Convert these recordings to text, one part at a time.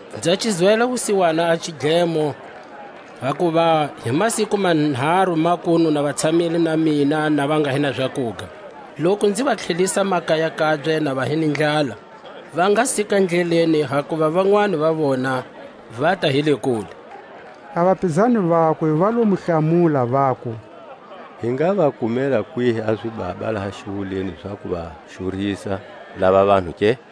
Nza xi zwela wusiwana a xidlemo, hakuva hi masiku manharu makunu na va tshamile na mina, na va nga hi na zakuga. Loku nzi va tlhelisa makaya kabye na va hi ni ndlala, va nga sika ndleleni; hakuva vanwani va vona vata hi le kule. A vapizani vakwe va lo mu hlamula, vaku: Hi nga va kumela kwihi a zibaba laha xiwuleni za ku va xurisa lava vanhu ke?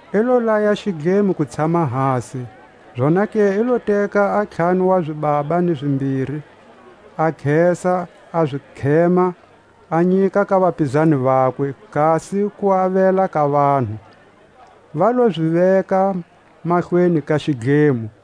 I lo laya xidlemo ku tshama hasi; zonake i lo teka a ntlhanu wa zibaba ni zimbiri, a khesa, a zi khema, a nyika ka vapizani vakwe, kasi ku avela ka vanhu; va lo zi veka mahlweni ka xidlemo.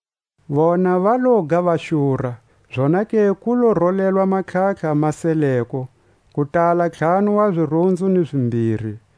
Vona va loga va xura, zonake ku lo rolelwa a matlhatlha ma seleko, ku tala ntlhanu wa zirunzu ni zimbiri.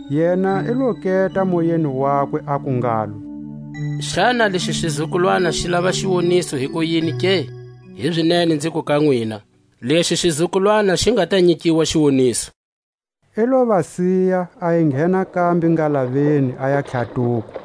Yena i lo keta moyeni wakwe, aku ngalo: Xana lexi xizukulwana xi lava xiwoniso hikuyini ke? Hizinene nziku ka nwina: Lexi xizukulwana xi nga ta nyikiwa xiwoniso. I lo va siya, a enghena kambe ngalaveni, aya tlhatuko.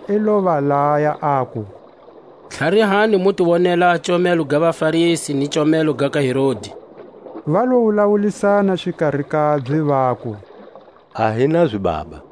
I lo va laya, aku: Tlharihani, mu ti wonela a comelo ga vaFarisi ni comelo ga ka Herodi. Va lo wulawulisana xikari kabye, vaku: A hi na zibaba.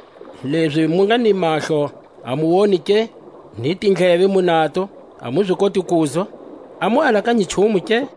Lezi mu nga ni mahlo, a mu woni ke? Ni tindleve mu nato, a mu zi koti kuzwa? A mu alakanyi nchumu ke?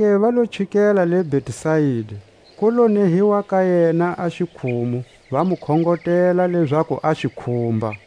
Zonake va lo chikela le Betsaida. Ku lo nehiwa ka yena a xikhumu, va mu khongotela lezaku a xi khumba.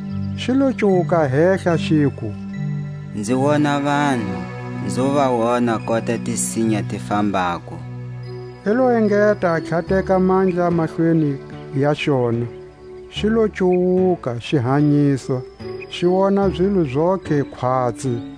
Xi lo cuwuka hehla, xiku: Nzi wona vanhu, nzo va wona kota tisinya ti fambako. I lo engeta a tlhateka mandla mahlweni ya xona; xi lo cuwuka, xi hanyiswa, xi wona zilo zontlhe khwatsi.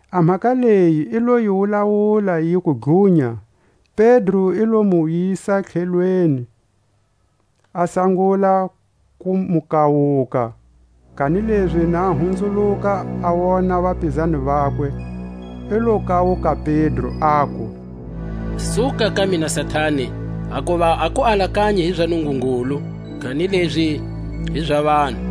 A mhaka leyi i lo yi wulawula yiku dlunya. Pedro i lo mu yisa tlhelweni, a sangula ku mu kawuka. Kanilezi na hunzuluka, a wona vapizani vakwe, i lo kawuka Pedro, aku: Suka ka mina Satani, hakuva a ku alakanyi hi za Nungungulu, kanilezi hi za vanhu.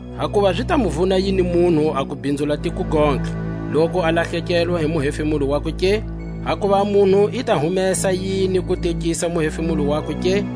Hakuva zi ta mu vuna yini munhu a ku bhinzula tiko gontlhe, loku a lahlekelwa hi muhefemulo wakwe ke? Hakuva a munhu i ta humesa yini ku tekisa muhefemulo wakwe ke?